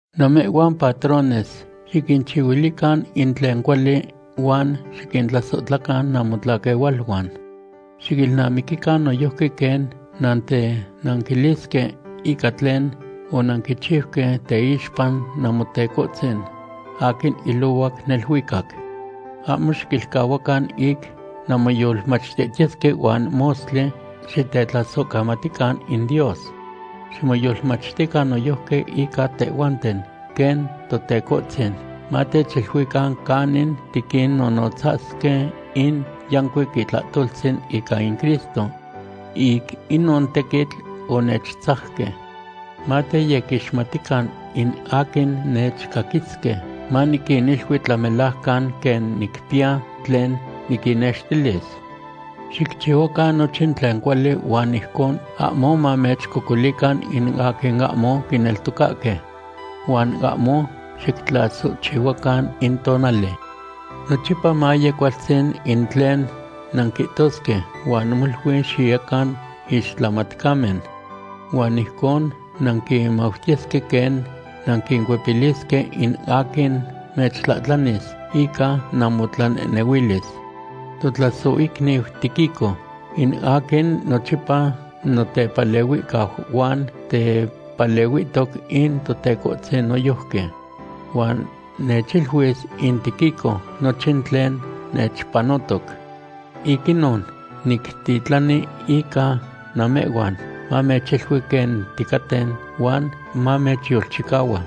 Namehhuan patrones xiquinchihuilican in tlen cuali huan xiquintlasohtlacan namotlaquehualuan. Xiquilnamiquican noyojqui quen nantenanquilisque ica tlen onanquichiuque teixpa Namotecohtzin aquin ilohuac neluicac. Ahmo xiquilcahuacan ic nanmoyolmachtihtiyesque huan mostli xitetlasohcamatican in Dios. Ximoyolmachtican noyojqui ica tehhuanten, quen Totecohtzin matechiluican canin tiquinnonotzasque in yancuic itlahtoltzin ica in Cristo. Ic inon tequitl onechtzajque. Mateyequixmatican in aquin nechcaquisque. Maniquinilui tlamelajcan quen nicpiya tlen niquinnextilis. Xicchihuacan nochin tlen cuali huan ijcon ahmo mamechcocolican in aquin ahmo quineltocahque. Huan ahmo xictlasohchihuacan in tonali. Nochipa maye cualtzin in tlen nanquihtosque huan molui xiyecan ixtlamatcamen. Huan ijcon nanquimautiyesque quen nanquicuepilisque in aquin mechtlahtlanis ica namotlanehnehuilis. Totlasohicniu Tíquico in aquin nochipa notepalehuihcau huan tepalehuihtoc in Totecohtzin noyojqui. Huan mechiluis in Tíquico nochin tlen nechpanotoc. Ic inon nictitlani ica namehhuan, mamechilui quen ticaten huan mamechyolchicahua.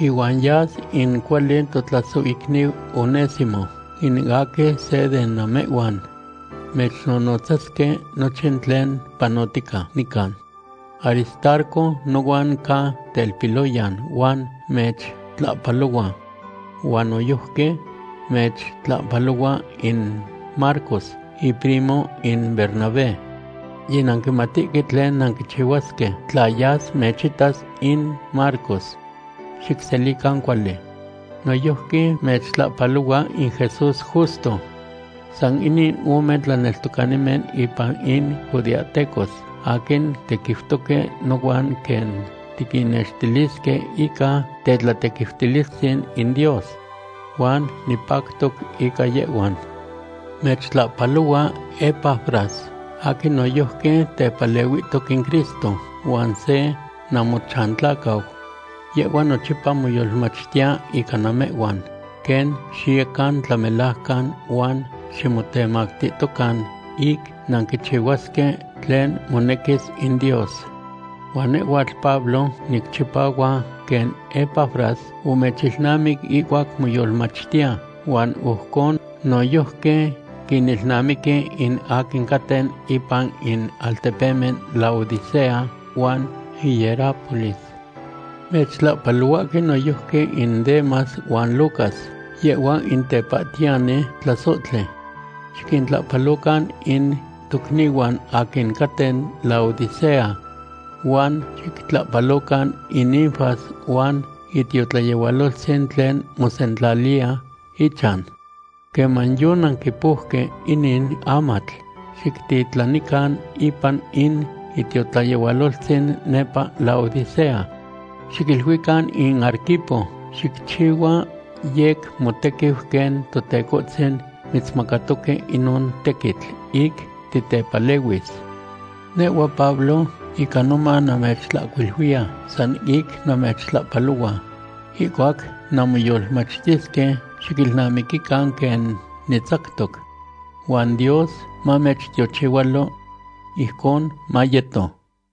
Ihuan yas in cuali totlasohicniu Onésimo, in aquin se de namehhuan. Mechnonotzasque nochin tlen panotica nican. Aristarco nohuan ca telpiloya huan mechtlahpalohua. Huan noyojqui mechtlahpalohua in Marcos, iprimo in Bernabé. Yinanquimatihque tlen nanquichihuasque tla yas mechitas in Marcos. Xicselican cuali. Noyojqui mechtlahpalohua in Jesús Justo. San inin ome tlaneltocanimen ipan in judeahtecos aquin tequiutoque nohuan quen tiquinnextilisque ica tetlatequiutilistzin in Dios. Huan nipactoc ica yehhuan. Mechtlahpalohua Epafras, aquin noyojqui tepalehuihtoc in Cristo, huan se namochantlacau. Yehhua nochipa moyolmachtiya ica namehhuan, quen xiyecan tlamelajcan huan ximotemactihtocan ic nanquichihuasque tlen monequis in Dios. Huan nehhuatl Pablo nicchipahua quen Epafras omechilnamic ihcuac moyolmachtiya, huan ojcon noyojqui quinilnamiqui in aquin caten ipan in altepemen Laodicea huan Hierápolis. Mechtlahpalohuahque noyojqui in Demas huan Lucas, yehhua in tepahtiyani tlasohtli. Xiquintlahpalocan in tocnihuan aquin caten Laodicea. Huan xictlahpalocan in Ninfas huan itiotlayehualoltzin tlen mosentlaliya ichan. Queman yonanquipouque inin amatl, xictitlanican ipan in itiotlayehualoltzin nepa Laodicea. Xiquiluican in Arquipo: “Xicchihua yec motequiu quen Totecohtzin mitzmacatoque inon tequitl ic titepalehuis.” Nehhua Pablo ica noman namechtlahcuiluiya san ic namechtlahpalohua. Ihcuac nanmoyolmachtisque xiquilnamiquican quen nitzactoc. Huan Dios mamechtiochihualo. Ijcon mayeto.